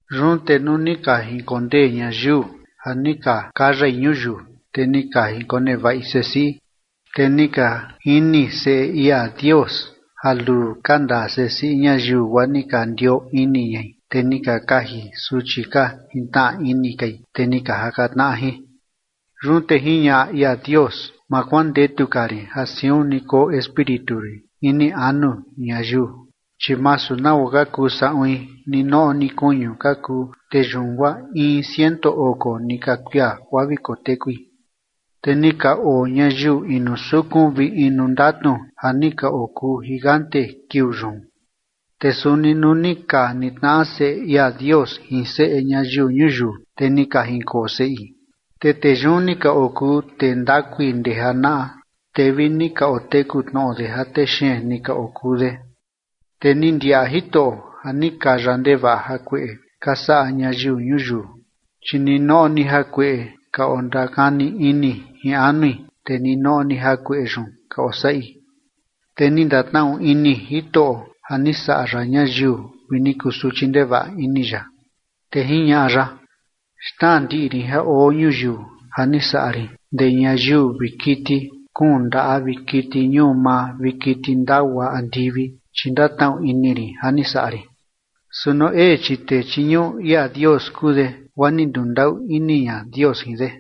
Yun te nuu ni ka jinkondee ñayiu ja ni ka kayai ñuyiu, te ni ka jinkonevaꞌi sesiꞌi. Te ni ka jini seꞌe ia Dios ja luu ka ndaa sesiꞌi ñayiu, guaa ni ka ndioo ini ñai, te ni ka kaji suchi ka jintnaꞌa ini kai, te ni ka jaka tnaꞌa jin. Yun te jiñaꞌa ia Dios: “Ma kuandetu ka rin ja siun ni koo espíritu rin ini anu ñayiu, chi masu nagua ka kuu saꞌuin, ninoꞌo ni kuñu ka kuu, te yun guaa in ciento oko ni ka kuia guaa vi kotekui”. Te ni ka oo ñayiu inu sukun vi inu ndatnu ja ni ka okuu gigante kiuu yun. Te suni nuu ni ka nitnaꞌa seꞌe ia Dios jin seꞌe ñayiu ñuyiu, te ni ka jinkoo seꞌi, te tee yun ni ka okuu tee ndakui ndee janaꞌa, te vi ni ka oteku tnoꞌo de ja tee xeen ni ka okuu de. Te ni ndiaꞌa Jitoꞌo ja ni kaya ndevaꞌa jakueꞌe ka saꞌa ñayiu ñuyiu, chi ninoꞌo ni jakueꞌe ka ondakani ini jin anui, te ninoꞌo ni jakueꞌe yun ka osaꞌi. Te ni ndatnaꞌu ini Jitoꞌo ja ni saꞌa ya ñayiu vi ni kusuchi ndevaꞌa ini ya. Te jiñaꞌa ya: “Xnaa ndiꞌi rin ja oo ñuyiu ja ni saꞌa rin ndee ñayiu vi kiti kuun ndaꞌa vi kiti ñuu maa vi kiti ndagua andivi, chi ndatnaꞌu ini rin ja ni saꞌa rin”. Su Noé, chi tee chiñuꞌu ia Dios kuu de, guaa ni ndundaꞌu ini ña Dios jin de.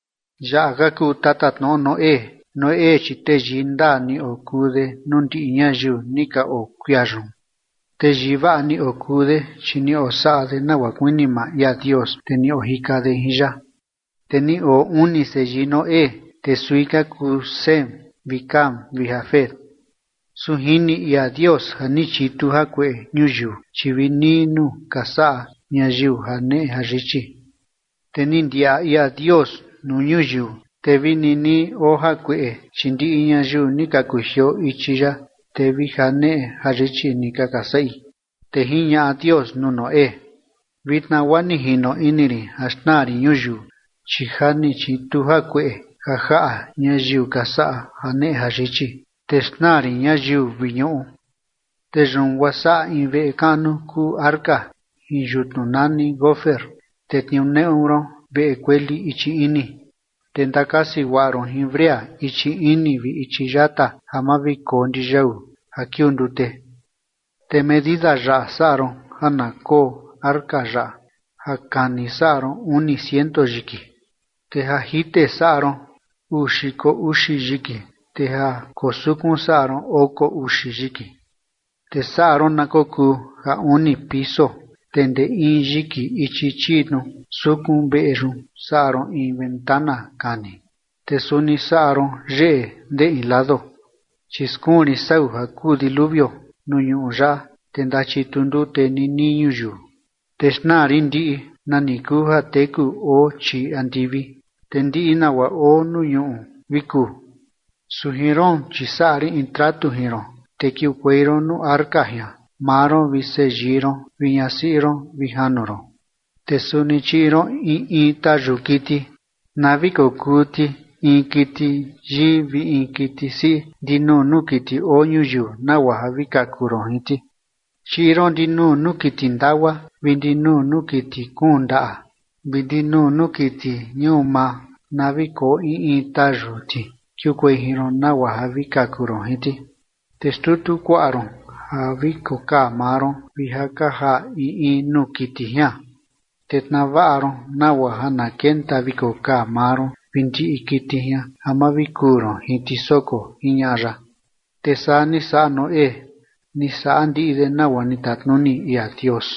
Yaꞌa ka kuu tatatnoꞌo Noé. Noé chi teyii ndaa ni okuu de nuu ndiꞌi ñayiu ni ka oo kuia yun. Teyii vaꞌa ni okuu de, chi ni osaꞌa de nagua kuini maa ia Dios, te ni ojika de jin ya. Te ni oo uni seyii Noé, te sui ka kuu Sem vi Cam vi Jafet. Su jini ia Dios ja ni chitu jakueꞌe ñuyiu, chi vi nii nuu ka saꞌa ñayiu janeꞌe jayichi. Te ni ndiaꞌa ia Dios nuu ñuyiu, te vi nii nii oo jakueꞌe, chi ndiꞌi ñayiu ni ka kujioo ichi ya, te vi janeꞌe jayichi nika ka saꞌi. Te jiñaꞌa Dios nuu Noé: ―Vitna guaa ni jino ini rin ja xnaa rin ñuyiu, chi ja ni chitu jakueꞌe ja jaꞌa ñayiu ka saꞌa janeꞌe jayichi, te xnaa rin ñayiu vi ñuꞌu. Te yun guaa saꞌa in veꞌe kaꞌnu kuu arca jin yutnu nani gofer, te tniuneꞌu ron veꞌe kueli ichi ini, te ndakasi guaꞌa ron jin brea ichi ini vi ichi yata ja ma vi koo ndiyau ja kiuu ndute. Te medida yaꞌa saꞌa ron ja na koo arca yaꞌa, ja kani saꞌa ron uni ciento yiki, te ja jite saꞌa ron uu xiko uxi yiki, te ja koo sukun saꞌa ron oko uxi yiki. Te saꞌa ron na kokuu ja uni piso, te ndee in yiki ichi chii tnu sukun veꞌe yun saꞌa ron in ventana kani, te suni saꞌa ron yeꞌe ndee in lado. Chi skuun rin sau ja kuu diluvio nuu ñuꞌu yaꞌa, te ndachitu ndute nii nii ñuyiu, te xnaa rin ndiꞌi nani kuu ja teku oo chii andivi, te ndiꞌi nagua oo nuu ñuꞌu vi kuu. Su jin roon, chi saꞌa rin in tratu jin ron, te kiukuei ron nuu arca jian, maa ron vi seyii ron vi ñasiꞌi ron vi janu ron. Te suni chiꞌi ron in in tayu kiti na vi kokuu ti in kiti yii vi in kiti siꞌi ndinuu nuu kiti oo ñuyiu nagua ja vi kaku ron jin ti. Chiꞌi ron ndinuu nuu kiti ndagua vi ndinuu nuu kiti kuun ndaꞌa vi ndinuu nuu kiti ñuu maa na vi koo in in tayu ti kiukuei jin ron, nagua ja vi kaku ron jin ti. Te xtutu kuaꞌa ron ja vi kokaa maa ron vi ja ka jaa in in nuu kiti jian, te tnaa vaꞌa ron nagua ja na kenta vi kokaa maa ron vi ndiꞌi kiti jian ja ma vi kuu ron jin ti soko ―jiñaꞌa ya. Te saa ni saꞌa Noé, ni saꞌa ndiꞌi de nagua ni tatnuni ia Dios.